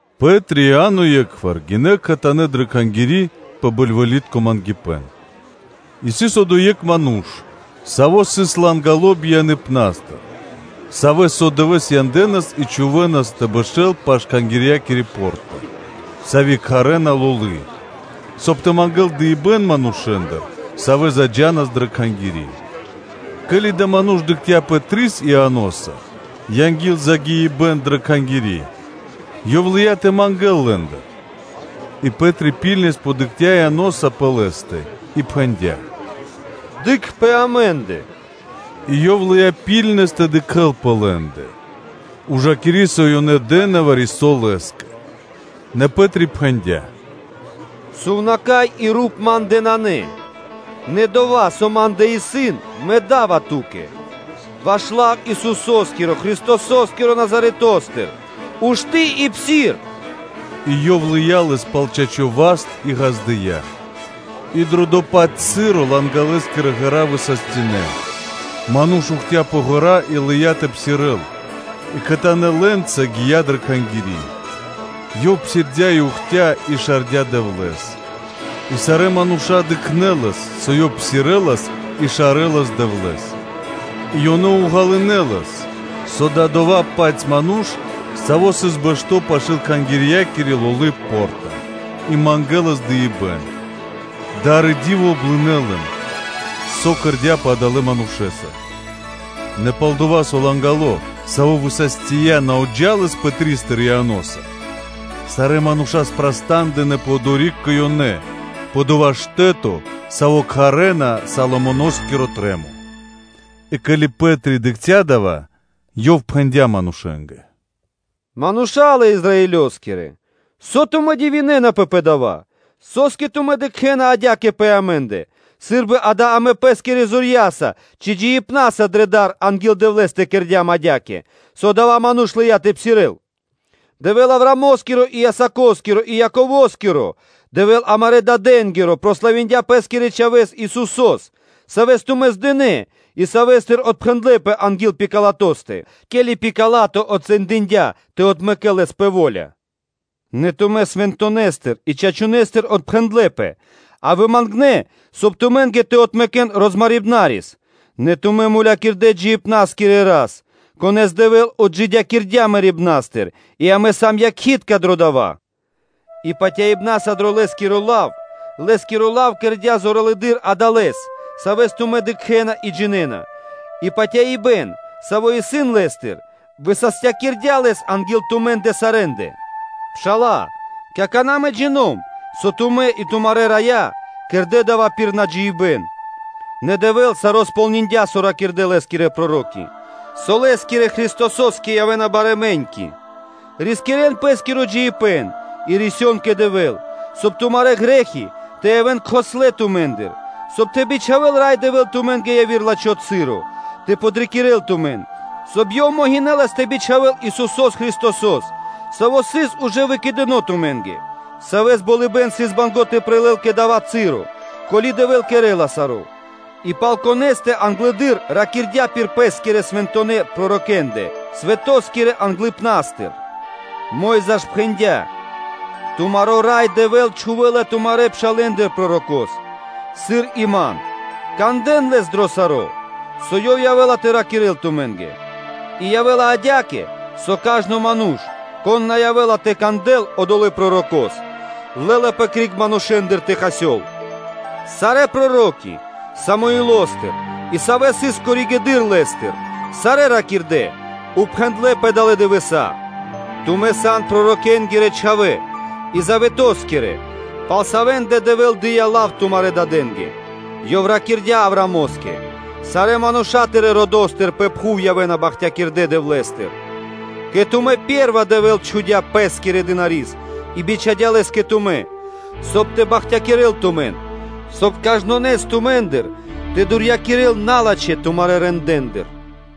Пэ́три и Иа́но е́кхвар гинэ́ кхэтанэ́ дрэ Кхангири́ пэ бэльвэлитко мангипэ́н: и сыс одо́й екх ману́ш, саво́ сыс лангало бияныпнастыр, савэ́с со дывэ́с янэ́нас и чхувэ́нас тэ бэшэ́л пашы́л Кхангирья́кири по́рта, сави́ кхарэ́на Лолы, соб (кай) ёв тэ мангэ́л дыибэ́н манушэ́ндыр, савэ́ заджанас дрэ Кхангири́; ке́ли адава́ ману́ш дыкхця́ Пэтрис Ианоса анги́л загиибэ́н дрэ Кхангири́, ёв лыя́ тэ мангэ́л лэ́ндыр. И Пэ́три ракхунэс дыкхця́ Ианоса пэ лэ́стэ и пхэндя́: “Дыкх по амэ́ндэ.” И ёв лыя́ ракхунэс тэ дыкхэ́л пэ лэ́ндэ, ужакири, со ёнэ дэ́на вари-со лэ́скэ. Нэ Пэ́три пхэндя́: “Сувнака́й и руп ма́ндэ нанэ; нэ дова́, со ма́ндэ исын, мэ да́ва ту́кэ: ваш лав Исусо́скиро Христосо́скиро Назаретостыр, ушты́ и псир.” И ёв лыя́ лэс пал чачо́ васт и ґаздыя́; и дрэ дова́-паць часо лангалэскирэ ґэра́ высастинэ. Ману́ш ухтя пэ ґэра́ и лыя́ тэ псирэ́л, и кхэтанэ́ лэ́нца гия́ дрэ Кхангири́, ёв псирдя́ и ухтя и шардя Дэвлэ́с. И сарэ́ мануша́ дыкхнэ́ лэс, сыр ёв псирэлас и шарэлас Дэвлэ́с; и ёнэ ґалынэ́ лэс, со ёв сыс дова́-паць ману́ш, саво́ сыс бэшто́ пашы́л Кхангирья́кири Лолы по́рта и мангэлас дыибэ́н; дар и ди́во облынэ лэн, со кэрдя́пэ адалэ́ манушэ́са. Нэ палдова́, со лангало, саво́ высастия, на отджалас Пэтристыр Ианоса, сарэ́ мануша́ прастандынэпэ одори́к кэ ёнэ, пэ дова́ штэ́то, саво́ кхарэ́на Соломоно́скиро трэ́мо. И ке́ли Пэ́три дыкхця́ дава́, ёв пхэндя́ манушэ́нгэ: “Мануша́лэ Израилёскирэ! Со тумэ́ дивинэнапэ пэ дава́? Со́скэ тумэ́ дыкхэ́на адя́кэ пэ амэ́ндэ, сы́рбы, акэ, амэ пэ́скирэ зорья́са ци джиибнаса дрэ дар анги́л Дэвлэ́стэ кэрдя́м адя́кэ, со адава́ ману́ш лыя́ тэ псирэ́л? Дэвэ́л Авраамо́скиро и Исако́скиро и Яково́скиро, Дэвэ́л амарэ́ дадэ́нгиро, прославиндя Пэ́скирэ Чхавэ́с Исусо́с, Савэс тумэ́ здынэ и Савэ́стыр отпхэндлэпэ анги́л Пилатостэ, ке́ли Пила́то отсэндиндя тэ отмэкэ́л Лэс пэ во́ля. Нэ тумэ́ Свэнтонэстыр и Чачунэстыр отпхэндлэпэ, а вымангнэ, соб (кай) тумэ́нгэ тэ отмэкэн розмарибнарис; нэ тумэ́ мулякирдэ́ джиибна́скирэ Шэрэ Рас, Конэ́с Дэвэ́л отджидякирдя́ мэрибна́стыр и амэ сам якхи́тка дро дава́. И патяибна́са дро Лэ́скиро лав кэрдя́ зоралэды́р адалэс, савэ́с тумэ́ дыкхэ́на и джинэ́на, и патяибэ́н, саво́ исын Лэ́стыр, высастякирдя́ лэс анги́л тумэ́ндэ сарэ́ндэ. Пшала́лэ! Какана́ мэ джино́м (джина́в), со тумэ́ и тумарэ́ раё, кэрдэ́ дава́ пир наджиныбэн; нэ Дэвэ́л саро́ кэрдя́ кэ ко́нцо/яго́ро (сполниндя), со ракирдэ́ Лэ́скирэ проро́ки, со Лэ́скирэ Христосо́скэ явэ́на барэ́ мэ́ньки. Рискирэ́н пэ́скиро джиибэ́н и рисён кэ Дэвэ́л, соб (кай) тумарэ́ грэ́хи тэ явэ́н кхослэ тумэ́ндыр; соб (кай) тэ бичхавэл Рай Дэвэ́л тумэ́нгэ яви́р лачхо́ часо тэ подрикирэ́л тумэн, соб (кай) Ёв могинэлас тэ бичхавэл Исусо́с Христосо́с, Саво́ сыс ужэ выкэдыно тумэ́нгэ; Савэс болыбэ́н сыс банго́ тэ прилэл кэ/жы́ко дава́ часо, пака Дэвэ́л кэрэ́ла саро́, и пал Конэ́стэ англэды́р ракирдя́ пир Пэ́скирэ свэнтонэ́ пророкэ́ндэ свэто́скирэ англыпна́стыр. Мо́йза ж пхэндя́: “Тумаро Рай Дэвэ́л чхувэ́ла тумарэ́ пшалэ́ндыр Пророко́с, сыр и ман; кандэ́н Лэс дро саро́, со Ёв явэ́ла тэ ракирэ́л тумэ́нгэ. И явэ́ла адя́кэ, со кажно ману́ш, кон на явэ́ла тэ кандэл одолэ́ Пророко́с, лэ́лапэ криг манушэ́ндыр тэ хасёл.” Сарэ́ проро́ки, Самуилостыр и савэ́ сыс коригэды́р (позжэ) лэ́стэ, сарэ́ ракирдэ́, упхэндлэ пэ далэ́ дывэса́. Тумэ́ сан пророкэ́нгирэ чхавэ́ и заветоскирэ, пал савэ́ндэ Дэвэ́л дыя́ лав тумарэ́ дадэ́нгэ; Ёв ракирдя́ Авраамо́скэ: ‘Сарэ́ мануша́ тырэ́ родо́стыр пэ пхув явэ́на бахтякирдэ Дэвлэ́стыр’. Кэ тумэ́ пэ́рва, Дэвэ́л отджидякирдя́ мэрибна́стыр Пэ́скирэ Чхавэ́с и бичхадя́ Лэс кэ тумэ́, соб (кай) тэ бахтякирэ́л тумэн, соб (кай) кажнонэс тумэ́ндыр тэ отрискирэл налачхэ́ тумарэ́ рэндэ́ндыр.”